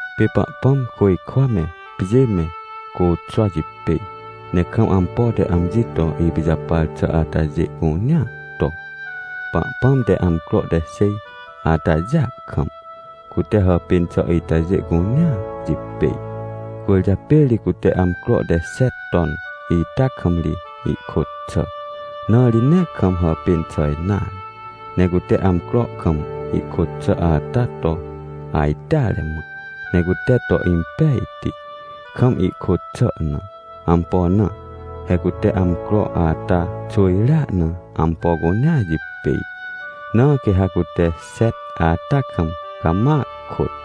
Pê Pahpãm côjkwa me, pjê me, côxwa jipêj, ne kam ampo te amji to ipijapar xà atajê cunea to. Pahpãm te amcro te xêj atajêa kam, cute hàpên xà itajê cunea jipêj. Cwỳrjapê ri cute amcro te xet ton ita kam ri ihkôt xà, na ri nee kam hàpên xà nare. Ne cute amcro kam ihkôt xà ata to ajteare mã, ne cute to impejti, kam ihkôt xà na. Ampo na? He cute amcro ata xwỳjrea na ampo cunea jipêj, na quê ha cute xet ata kam cama kôt.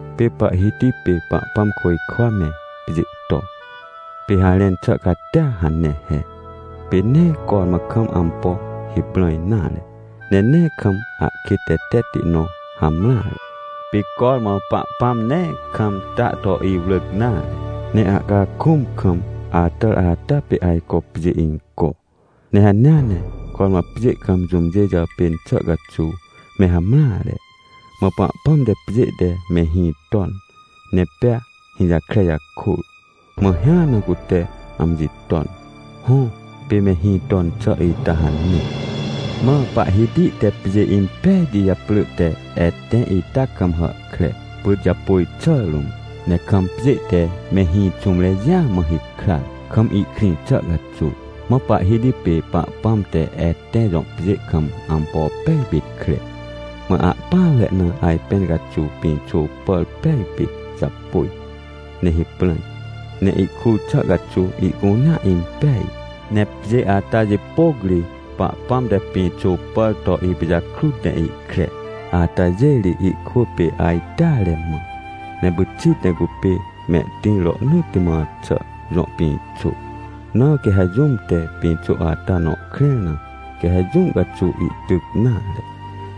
Pê Pahhiti pê Pahpãm côjkwa me pjê to. Pê harẽn xà catia hane he: Pê nee cormã kam ampo hiprãj nare, ne nee kam ahkêt tetetti nõ hamreare. Pê cormã Pahpãm nee kam ta to iwrỳc nare, ne ahcakũm kam atàr ata pê ajco pjê inco. Ne hanea ne cormã pjê kam jũmjê jàpên xà caxuw me hamreare. Mã Pahpãm te pjê te mehĩ ton ne pea hĩjakre jakôr, mã hĩa na cute amji ton. Hõ, pê mehĩ ton xà ita hane. Mã Pahhiti te pjê impejti japrỳ te Etẽ ita kam hàhkre, pyt japôj xà rũm, ne kam pjê te mehĩ xũmre jĩa mã hikran, kam ihkrĩ xà caxuw. Mã Pahhiti pê Pahpãm te Etẽ jõ pjê kam ampo pej pit kre. Mã ahpỹanre na ajpẽn caxuw pĩxô pàr pej pit japôj ne hiprãj, ne ihkur xà caxuw ihcunea impeaj. Ne pjê ata jipôc ri Pahpãm te pĩxô pàr to ipijakrut ne ihkre, atajê ri ihkwỳ pê ajteare mã. Ne pyxit ne cupê mehtĩr rohnỳtti mã xà jõ pĩxô. Na quê ha jũm te pĩxô ata nõ krẽr na, quê ha jũ caxuw ihtyc nare,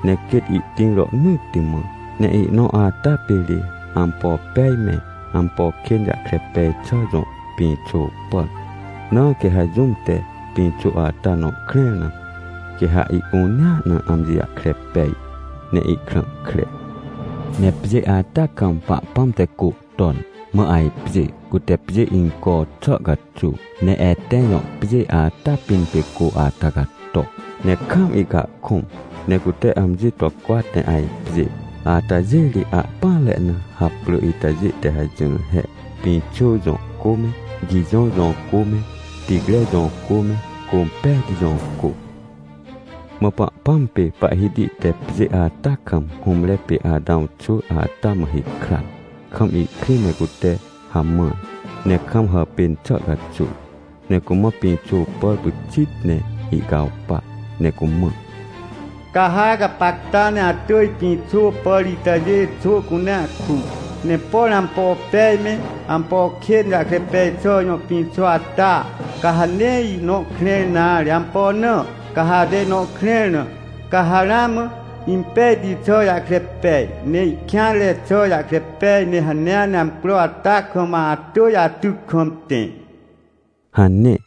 ne quêt ihtĩr rohnỳtti mã. Ne ihnõ ata pê ri ampo pej me, ampo kên jahkre pej xà jõ pĩxô pàr. Na quê ha jũm te pĩxô ata nõ krẽr na, quê ha ihcunea na amji jahkre pej ne ihkrã kre. Ne pjê ata kam Pahpãm te cô ton, mã ajpjê, cute pjê inco xà caxuw. Ne Etẽ jõ pjê ata pĩn pê cô ata cato, ne kaam ihcahkũm, ne cute amji to cwat ne ajpjê. Atajê ri ahpỹanre na haprỳ itajê te hajỹr he: Pixõ jõ cô me, Gijõ jõ cô me, Ticre jõ cô me, Cômpejti jõ cô. Mã Pahpãm pê Pahhiti te pjê ata kam hũmre pê Atãw xwỳ ata mã hikran, kam ihkrĩ ne cute hamãr, ne kam hàpên xà caxuw. Ne cumã pĩxô pàr pyxit ne ihcawpa ne cumã: — Ca ha gapacta ne atỳj pĩxô pàr itajê xô cunea ku, ne por ampo pej me, ampo kên jahkre pej xà jõ pĩxô ata, ca ha nee ihnõ krẽr nare. Ampo na? Ca ha ate ihnõ krẽr na, ca ha ramã impejti xà jahkre pej, ne ihkêanre xà jahkre pej, ne hanea ne amcro ata kam atỳj atyc kam tẽ — hane.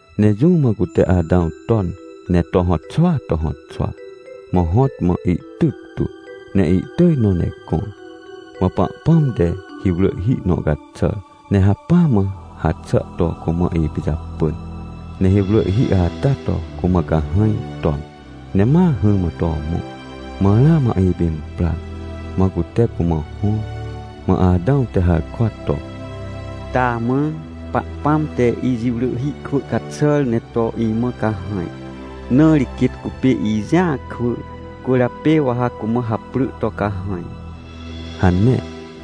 Ne jũ mã cute Atãw ton ne to hõtxwaa to hõtxwa, mã hõt mã ihtyctu, ne ihtỳj nõ ne gõr. Mã Pahpãm te hiwrỳhhi nõ caxàr, ne hacpỹa mã haxà to cumã ipijapỳn. Ne hiwrỳhhi ata to cumã cahãj ton, ne ma hỹrmã to mõ, mã ramã ipimprar, mã cute cumã hõr. Mã Atãw te harkwa to: — Taamã! Pahpãm te ijiwrỳhhi kwỳ caxàr ne to imã cahãj, na ri quêt cupê ijĩa kwỳ, cwỳrjapê wa ha cumã haprỳ to: “Cahãj” — hane.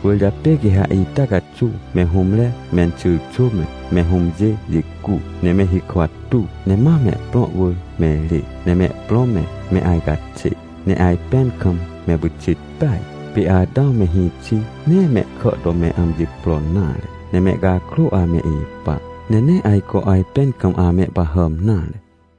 Cwỳrjapê quê ha ita caxuw me hũmre menxyrxwỳ me, me hũmjê jicu, ne me hikwa tuw, ne ma mehprõ wỳr me rê, ne mehprõ me, me ajcaxê ne ajpẽn kam me pyxit peaj. Pê Atãw me hĩxi nee mehkà to me amji pro nare, ne mehcakrô ame ipa, ne nee ajco ajpẽn kam amehpahàm nare.